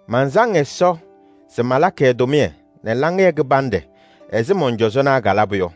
Mansaŋ Ɛsɔ se malakɩ ɛ-tʋmɩyɛ nɛ laŋɩyɛ kɩbanɖɛ ɛzɩ mɔn-cɔzɔnaa kalabʋ yɔ.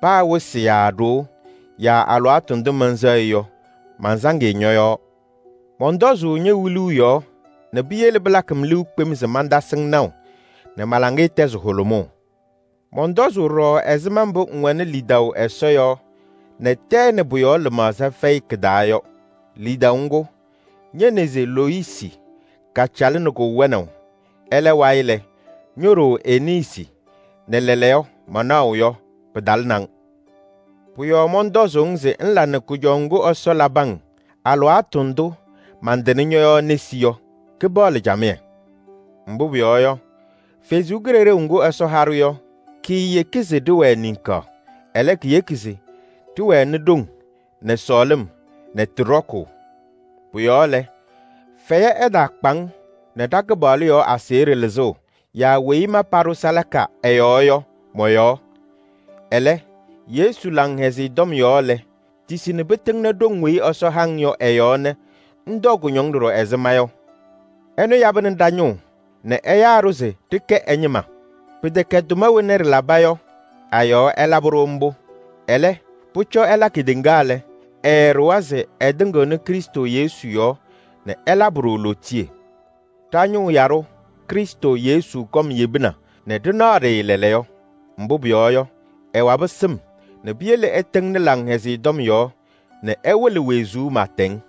Paa wɩsɩ yaa ɖoo yaa alɩwaatʋ ndʋ mɛnsɛɣ-ɩ yɔ, mansaŋ-ɩ ñɔ-yɔɔ. Mɔntɔzʋʋ ñe-wiluu yɔɔ nɛ piyele pɩlakɩ-m liu kpem se mantasɩ-ŋ naʋ nɛ ma-laŋɩyɛ tɛzɩ hʋlʋmʋʋ. Mɔntɔzʋʋ ɖɔɖɔ ɛzɩma mbʋ ŋwɛnɩ lidaʋ Ɛsɔ yɔɔ nɛ tɛɛ nɛ pʋ-yɔɔ lɩmaɣza fɛyɩ kɩ-taa yɔ. Lidaʋ ŋgʋ, ñe-neze Loyisi kacalɩnɩ-kʋ wɛnaʋ, ɛlɛ wayɩ lɛ, ño-ɖoo Eniisi nɛ lɛɛlɛɛyɔ manaɣʋ yɔ, pɩtalɩnɩ-ŋ. Pʋ-yɔɔ mɔntɔzʋʋ-ŋ se ŋla nɛ kʋjɔʋ ŋgʋ Ɛsɔ labɩ-ŋ alɩwaatʋ ndʋ mantɩnɩ ñɔ-yɔɔ nesi yɔ, kɩpaɣlɩ camɩyɛ. Mbʋ pʋyɔɔ yɔ, Kalɩzaɣ ŋga Ɛsɔ ha-ɖʋ yɔ, kaayeki se ɖɩwɛɛ ninika, ɛlɛ, keyeki se ɖɩwɛnɩ ɖoŋ nɛ sɔɔlɩm nɛ tɩ ɖɔkʋʋ. Pʋ-yɔɔ lɛ, fɛyɛ ɛtaakpa-ŋ nɛ ɖa-Kɩpaɣlʋ yɔɔ aseɣɖe lɩzʋʋ yaa weyi ma paɖʋ salaka ɛ-yɔɔ yɔ mɔ-yɔɔ. Ɛlɛ, Yesu Laŋhɛzɩyɛ Tɔm yɔɔ lɛ, tisi nɛ pɩtɩŋnɩ ɖoŋ weyi Ɛsɔ ha-ŋ yɔ ɛ-yɔɔ nɛ ŋtɔɔ kʋñɔŋ ɖɔɖɔ ɛzɩ ma yɔ. Ɛnʋ yabɩnɩ ɖa-ñʋʋ nɛ ɛyaa-ɖʋ se ɖɩkɛ ɛ-ñɩma. Pɩtɛkɛ tʋma wena ɖɩlaba yɔ a-yɔɔ ɛlabɩ-ɖʋ mbʋ. Ɛlɛ, pʋcɔ ɛla kedeŋa lɛ, ɛɛɖʋwa se ɛtɩŋɩɣnɩ Krɩstʋ Yesu yɔɔ nɛ ɛlabɩ-ɖʋ lootiye. Ɖa-Ñʋʋ Yaɖʋ Krɩstʋ Yesu kɔm yebina nɛ ɖɩnaɣ-ɖɩ lɛɛlɛɛyɔ. Mbʋ pʋyɔɔ yɔ, ɛwabɩ sɩm nɛ piyele ɛtɩŋnɩ Laŋhɛzɩyɛ Tɔm yɔɔ nɛ ɛwɩlɩ wezuu pɩɩtɛŋ.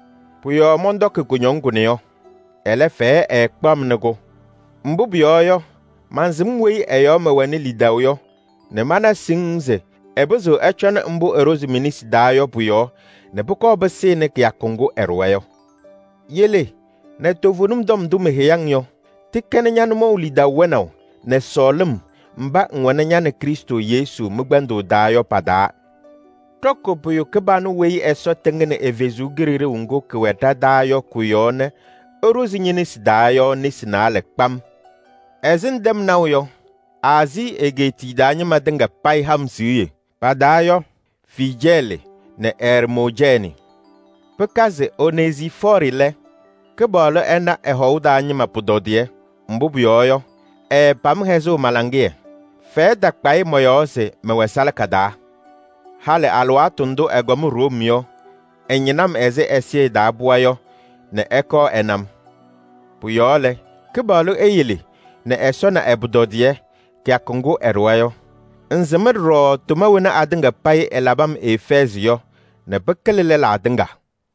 Pʋ-yɔɔ mɔntɔkɩ kʋñɔŋ kʋnɛ yɔ. Ɛlɛ, fɛyɛ ɛɛkpaɣ-m nɛ kʋ, mbʋ pʋyɔɔ yɔ, mansɩm weyi ɛ-yɔɔ mɛwɛnɩ lidaʋ yɔ nɛ mana siŋŋ se ɛpɩzɩɣ ɛcɔnɩ mbʋ ɛɖʋzɩ me-nesi taa yɔ pʋ-yɔɔ nɛ pʋkɔɔ pɩsɩnɩ kɩyakʋ ŋgʋ ɛɖʋwa yɔ. Yele nɛ toovenim tɔm ndʋ meheyi-ŋ yɔ, tɩkɛnɩ ña-nʋmɔʋ lidaʋ wɛnaʋ nɛ sɔɔlɩm mba ŋwɛnɩ ña nɛ Krɩstʋ Yesu mɩ-kpɛndʋʋ taa yɔ pa-taa. Ɖɔkɩ pʋyʋ kɩbanʋ weyi Ɛsɔ tɩŋnɩ ɛ-Kalɩzaɣ ŋga kɛwɛ ɖa-taa yɔ kɔ-yɔɔ nɛ ɛɖʋzɩ ñe-nesi taa yɔ nesi naalɛ kpam. Ɛzɩ ŋtɛm naʋ yɔ, Aazii egeetiye taa ñɩma tɩŋa payɩ ha-m siɣye, pa-taa yɔ: Fiijɛɛlɩ nɛ Ɛrmoojɛɛnɩ. Pɩkazɩ Onezifɔɔrɩ lɛ, Kɩpaɣlʋ ɛna ɛ-hɔʋ taa ñɩma pʋtɔdɩyɛ. Mbʋ pʋyɔɔ yɔ, ɛɛpam hɛzʋʋ ma-laŋɩyɛ, fɛyɛ takpa-ɩ mɔ-yɔɔ se mɛwɛ salaka taa. Halɩ alɩwaatʋ ndʋ ɛkɔm Room yɔ, ɛñɩnɩ-m ɛzɩ ɛzɩyɛ taa pɩɣa yɔ nɛ ɛkɔɔ ɛna-m. Pʋ-yɔɔ lɛ, Kɩpaɣlʋ eyele nɛ Ɛsɔ na ɛ-pʋtɔdɩyɛ kɩyakʋ ŋgʋ ɛɖʋwa yɔ. Ŋsɩm ɖɔɖɔ tʋma wena atɩŋa payɩ ɛlabɩ-m Efɛɛzɩ yɔ nɛ pɩkɩlɩ lɛlaa tɩŋa.